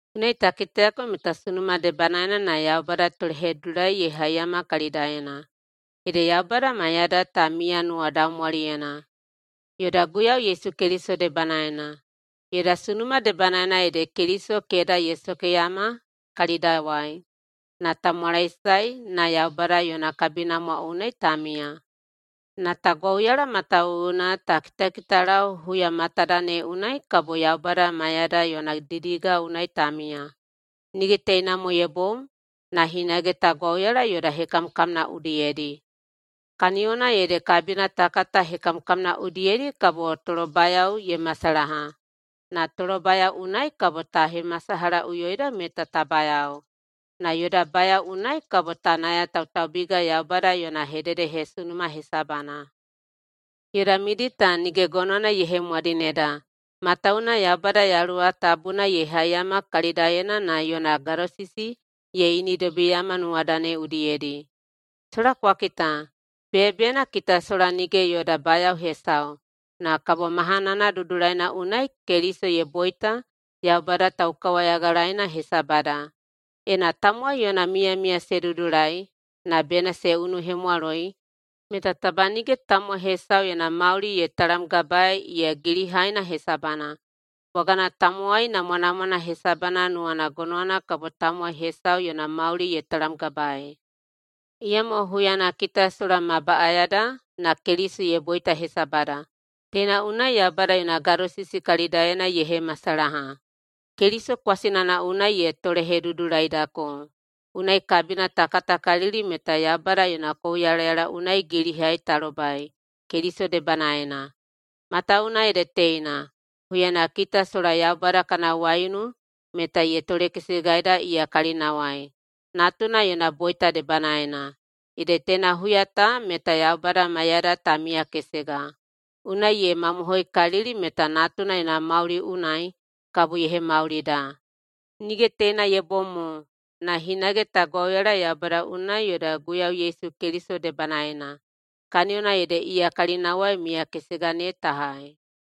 Unai ta kitayako meta sunuma debanaena na Yaubada tolehedudulai ye haiyama kalidaena. Ede Yaubada maiyada ta miya nuwadaumwaliyena, yoda Guiyau Yesu Keliso debanaena. Yoda sunuma debanaena ede Keliso keda ye sokeyama kalidawai na ta mwalaesae na Yaubada yona kabinamwa unai ta miya. Na ta gwauyala matawuwuna ta kitakitalau huya matada ne unai kabo Yaubada maiyada yona didiga unai ta miya. Nige teina mo ye bom, na hinage ta gwauyala yoda hekamkamna udiyedi, kaniyona ede kabina ta kata hekamkamna udiyedi kabo tolobayao ye masalaha, na tolobayao unai kabo ta hemasalahaꞌuyoida meta ta bayao, na yoda bayao unai kabo ta nayatautaubiga Yaubada yona hededehesunuma hesabana. Yoda midi ta nige gonowana ye hemwadineda, matawuwuna Yaubada Yaluwa Tabuna ye haiyama kalidaena na yona gadosisi ye inidobiyeiyama nuwada ne udiyedi. Sola kwa kita! Beyabeyana kita sola nige yoda bayao hesau, na kabo mahanana dudulaina unai Keliso ye boita Yaubada taukawayagalaeina hesabada. Ena tamowai yona miyamiya se dudulai, [na bena se unuhemwaloi,] meta taba nige tamowai hesau yona mauli ye talamgabaei [iya gilihaina] hesabana, bwagana tamowai namwanamwana hesabana nuwana gonowana kabo tamowai hesau yona mauli ye talamgabaei. Iyamo huyana kita sola ma baꞌayada na Keliso ye boita hesabada. Teina unai Yaubada yona gadosisi kalidaena ye hemasalaha. Keliso kwasinana unai ye tolehedudulaidako, unai kabina ta katakalili meta Yaubada yona kouyalayala unai gilihai ta lobai Keliso debanaena. Matawuwuna ede teina: Huyana kita sola Yaubada kana waiunu meta ye tolekesegaida iya kalinawai natuna yona boita debanaena, ede teina huya ta meta Yaubada maiyada ta miyakesega. Unai ye mamohoikalili meta Natuna yona mauli unai kabo ye hemaulida. Nige teina ye bom mo, na hinage ta gwauyala Yaubada unai yoda Guiyau Yesu Keliso debanaena, kaniyona ede iya kalinawai miyakesega ne ta hai.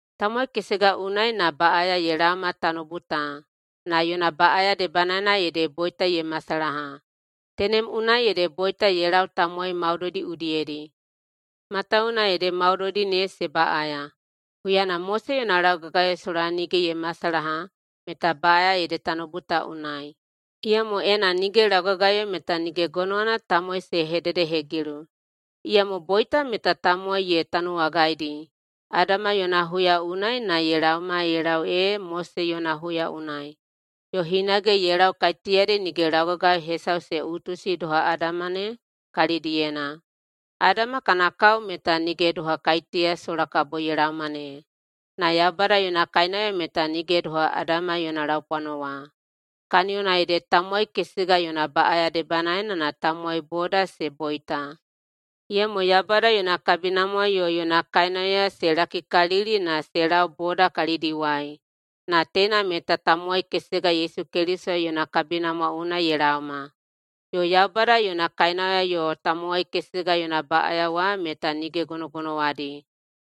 Tamowai kesega unai na baꞌaya ye laoma tanoubu ta, na yona baꞌaya debanaena ede boita ye masalaha. Tenem unai ede boita ye lau tamowai maudoidi udiyedi, matawuwuna ede maudoidi ne se baꞌaya. Huyana Mose yona laugagayo sola nige ye masalaha meta baꞌaya ede tanoubu ta unai, iyamo ena nige laugagayo meta nige gonowana tamowai se hededehegilu. Iyamo boita meta tamowai ye tanuwagaidi Adama yona huya unai na ye laoma ye lau ee Mose yona huya unai, yo hinage ye lau kaiteyadi nige laugagayo hesau se utusi doha Adama ne kalidiyena. Adama kana kao meta nige doha kaiteya sola kabo ye laoma ne. Na Yaubada yona kainauya meta nige doha Adama yona laupwano wa, kaniyona ede tamowai kesega yona baꞌaya debanaena na tamowai boda se boita, iyamo Yaubada yona kabinamwa yo yona kainauya se lakikalili na se lau boda kalidiwai, na teina meta tamowai kesega Yesu Keliso yona kabinamwa unai ye laoma. Yo Yaubada yona kainauya yo tamowai kesega yona baꞌaya wa meta nige gonogonowadi.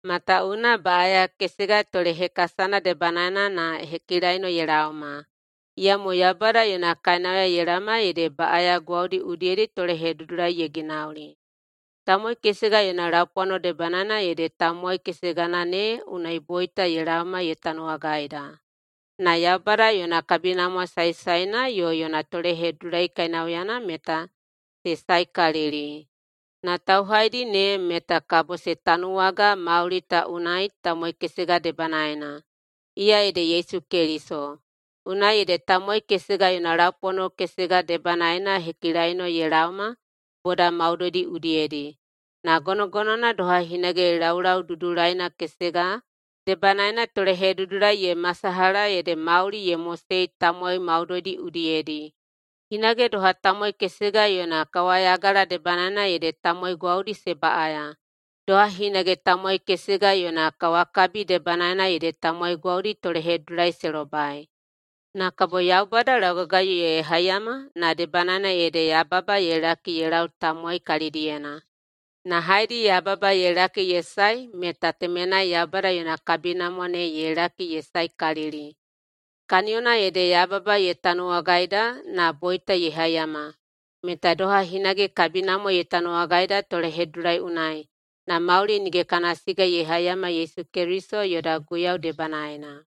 Matawuwuna baꞌaya kesega tolehekasana debanaena na hekilaino ye laoma, iyamo Yaubada yona kainauya ye laoma ede baꞌaya gwaudi udiyedi tolehedudulai ye ginauli. Tamowai kesega yona laupwano debanaena ede tamowai kesegana ne unai boita ye laoma ye tanuwagaida. Na Yaubada yona kabinamwa saesaena yo yona tolehedudulai kainauyana meta se saekalili, na tauhaidi ne meta kabo se tanuwaga mauli ta unai tamowai kesega debanaena, iya ede Yesu Keliso. Unai ede tamowai kesega yona laupwano kesega debanaena hekilaino ye laoma boda maudoidi udiyedi, na gonogonowana doha hinage laulau dudulaina kesega debanaena tolehedudulai ye masalaha ede mauli ye mosei tamowai maudoidi udiyedi. Hinage doha tamowai kesega yona kawayagala debanaena ede tamowai gwaudi se baꞌaya, doha hinage tamowai kesega yona kawakabi debanaena ede tamowai gwaudi tolehedudulai se lobai. Na kabo Yaubada laugagayo ye haiyama na debanaena ede yababa ye laki ye lau tamowai kalidiyena. Na haedi yababa ye laki ye sae meta temenai Yaubada yona kabinamwa ne ye laki ye saekalili. Kaniyona ede yababa ye tanuwagaida na boita ye haiyama, meta doha hinage kabinamwa ye tanuwagaida tolehedudulai unai na mauli nige kana siga ye haiyama Yesu Keliso yoda Guiyau debanaena.